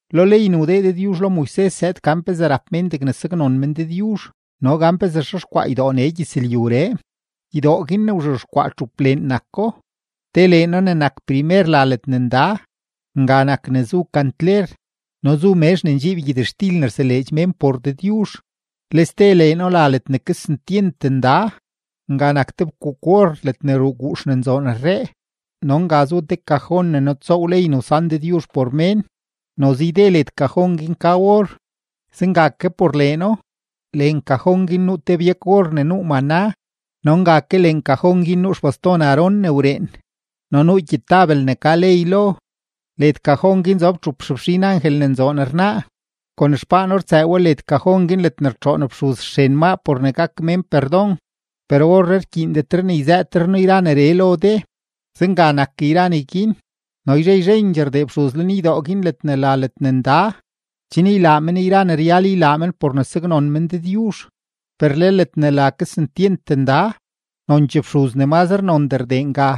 Lo ley ne wdee Dëdyuzh lo Moises zëëd gan pezee rap mén degne saknon mén Dëdyuzh no gan pezee xexkwaa ydoo nee gyëzlyuree. Ydoo guin ne wzhexkwaa txup leen nako, te leeno ne nak primer la Ledne Nda; nga nak ne zu kantler no zu mezh ne ndxiib gyëtxtil ne rseleedx mén por Dëdyuzh. Le ste leeno la Ledne Kesentyent Nda; nga nak te fkuuk-or ledne ruu guux ne nzoon rree no nga zu te kajon ne nutsoow ley ne wsan Dëdyuzh por mén, noze yde led kajon guin ka or, zenga ke por leeno. Leen kajon guin nuu te byak-or ne nuu maná no nga ke leen kajon guin nuu xbaston Aarón ne wreen no nuu gyetabel ne ka ley lo. Led kajon guin zob txup xefxin angel ne nzoon rnaa, kon xpaano rtsëë we led kajon guin ledne rtxoon fxuz xren maa por ne gak mén perdon. Per orree rkyiindet ne yzëëtre noo yra neree lo de. Zenga nak yra neguin, no yzhe yzhendxee rdee fxuz lenydoo guin ledne la Ledne Nda, chen ylaa men yra ne ryal ylaa men por ne saknon men Dëdyuzh. Per le ledne la Kesentyent Nda, nonchee fxuz ne mazre nondee rdee nga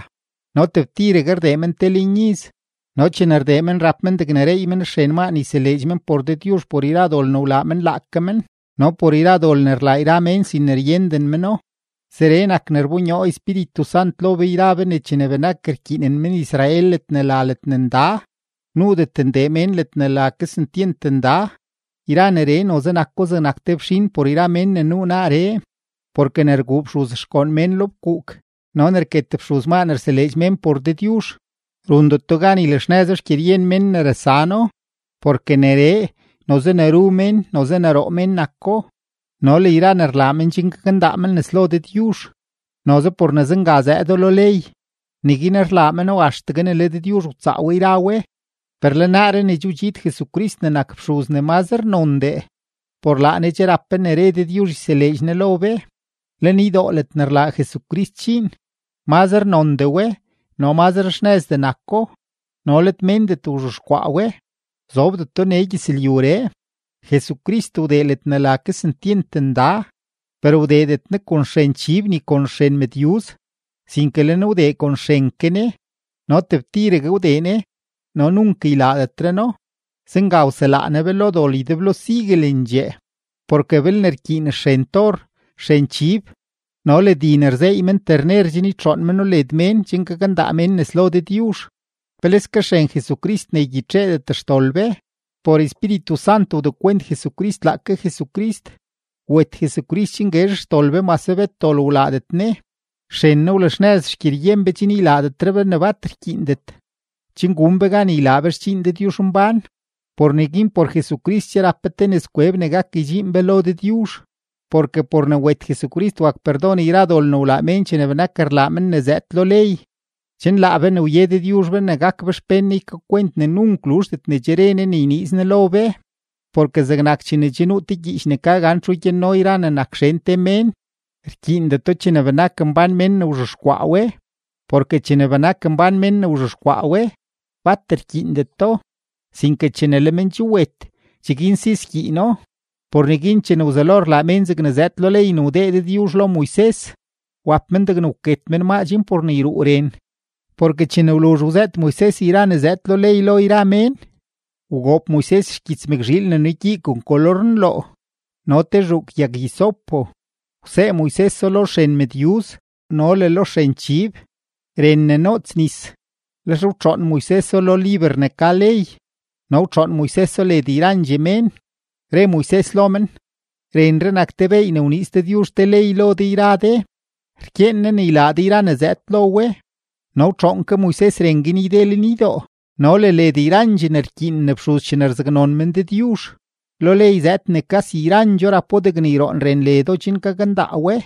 no tebtiregue rdee men te leen iz, no chene rdee men, rap men degne reey men xren maa ne yseleedx men por Dëdyuzh por yra dol ne wlaa men laake men no por yra dol ne rlaa yra mén sin ne ryenden méno. Zeree nak ne rbonyoo Espíritu Sant lo be yra be ne chene benak rkyiinen men-Israel ledne la Ledne Nda, nuudet ndee mén ledne la Kesentyent Nda. Yra neree noze nako zegnak te fxin por yra mén ne nuu naaree; porke ne rguu fxuz xgoon mén lo fkuuk no ne rket fxuz maa ne rseleedx mén por Dëdyuzh, rundeto gan ylaxnëzo xgyeryen mén ne rasano. Porke neree, noze ne ru mén, noze ne roo men nako, no le yra ne rlaa men chen gakndaa men nes lo Dëdyuzh, noze por ne zenga zëëdo lo ley, neguin rlaa meno axtegue ne le Dëdyuzh wtsaa we yra we. Per le naaree ne che wdxiid Jesucrist ne nak fxuz ne mazre nondee, por laa Ne che rap be ne re Dëdyuzh yseleedx Ne lo be; lenydoo ledne rlaa Jesucrist dxiin, mazre nondee we no mazre xnëzdee nako no let méndet wzhexkwaa we, zobdeto nee gyëzlyuree. Jesucrist wdee ledne la Kesentyent Nda, per wdeedet Ne kon xren chib ni kon xren mëdyuz, sinke le Ne wdee kon xren ke Ne, no tebtiregue wdee Ne, no nunk ylaadetre No, zenga wselaa Ne be lo dol ydeblo siguelendxee. Porke belne rkyiin xren tor, xren chib no le di ne rzeey men terner chen rtxoon meno led mén chen gakndaa mén nes lo Dëdyuzh, ¡peleske xren Jesucrist ne ygyitxeedet xdol be! Por Espíritu Sant wdekwent Jesucrist laake Jesucrist, wet Jesucrist chen guezh xdol be mase bet dol wlaadet Ne; xren Ne wlaxnëz xgyeryen be chen ylaadetre be ne bat rkyiindet, chen gun be gan ylaa be xdxiin Dëdyuzhmbán. Por neguin, por Jesucrist che rap be te nëzkweb ne gak ydxiin be lo Dëdyuzh, porke por ne wet Jesucrist wak perdon yra dol ne wlaa mén chene benak rlaa men ne zëëd lo ley, chen laa be ne wye Dëdyuzh be ne gak be xpén Ne ykakwent ne nunk luzhdet ne che re Ne ne yniiz Ne lo be. Porke zegnak chene nuu te gyiich ne ka gan txu gyanno yra ne nak xen te mén, rkyiindeto chene benak mbán men ne wzhexkwaa we. Porke chene benak mbán men ne wzhexkwaa we, bat rkyiindeto, sinke chene le men che wet, cheguin si skyiino. Por neguin chene wzelo rlaa mén zegne zëëd lo ley ne wdee Dëdyuzh lo Moises, wap men degne wket men maa chen por ne yruu ren. Porke chene wluzh wzëët Moises yra ne zëëd lo ley lo yra mén, wgoob Moises xgyits mëkzhiil ne nugyii kon kolor nloo no te zhuuk yag-hisopo, wsee Moiseso lo xren mëdyuz no le lo xren chib, ren ne noots nis, lex wtxoon Moiseso lo liber ne ka ley no wtxoon Moiseso led yrandxee mén. Re Moises lo men: “Renree nak te beey ne wniiz Dëdyuzh te ley lo de yra de, rkyeen Ne ne ylaa de yra ne zëëd lo we.” No wtxoon ke Moises ren guin yde lenydoo no le led yrandxee ne rkyiinen fxuz chene rzaknon men Dëdyuzh. Lo ley zëëd ne kasi yrandxoo rapo degne yroon ren ledo chen gakndaa we;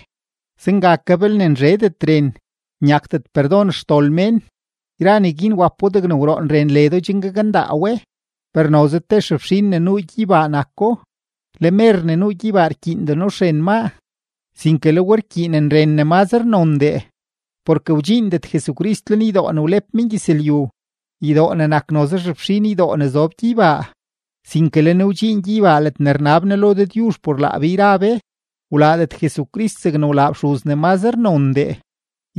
zenga ke belne nzhedet ren, nyakdet perdon xdol mén. Yra neguin wapo degne wroon ren ledo chen gakndaa we, per noze te xefxin ne nuu gyeybaa nako; le mer ne nuu gyeybaa rkyiindeno xren maa, sinke le we rkyiinen ren ne mazre nondee. Porke wdxiindet Jesucrist lenydoo ne wlep mengyëzlyu, ydoo ne nak noze xefxin ydoo ne zob gyeybaa, sinke le Ne wdxiin gyeybaa ledne rnab Ne lo Dëdyuzh por laa be yra be. Wlaadet Jesucrist zegne wlaa fxuz ne mazre nondee,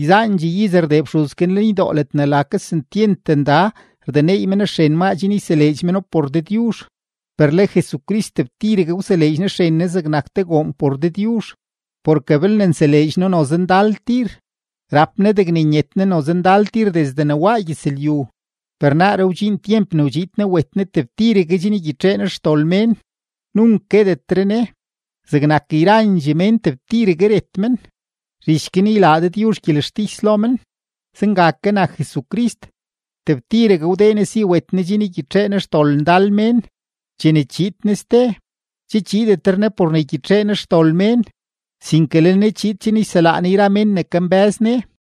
yzaandxee iz rdee fxuz guin lenydoo ledne la Kesentyent Nda rdeneey men xren maa chen yseleedx meno por Dëdyuzh. Per le Jesucrist, tebtiregue wseleedx Ne xren Ne zegnak te goon por Dëdyuzh. Porke belne nseleedx No noze ndal tir, rap Ne degne nyet Ne noze ndal tir desde ne waa gyëzlyu, per naaree wdxiin tyemp ne wdxiid Ne wet Ne tebtiregue chen ygyitxee Ne xdol mén, nunk guetetre Ne. Zegnak yrandxee mén, tebtiregue ret men, zhich guin ylaa Dëdyuzh gyelextis lo men, zenga ke nak Jesucrist, tebtiregue wdee Ne si wet Ne chen ygyitxee Ne xdol ndal mén. Chene chiid Ne ste, che chiidetre Ne por ne ygyitxee Ne xdol mén, sinke le Ne chiid chen yselaa Ne yra men ne kambë́z Ne.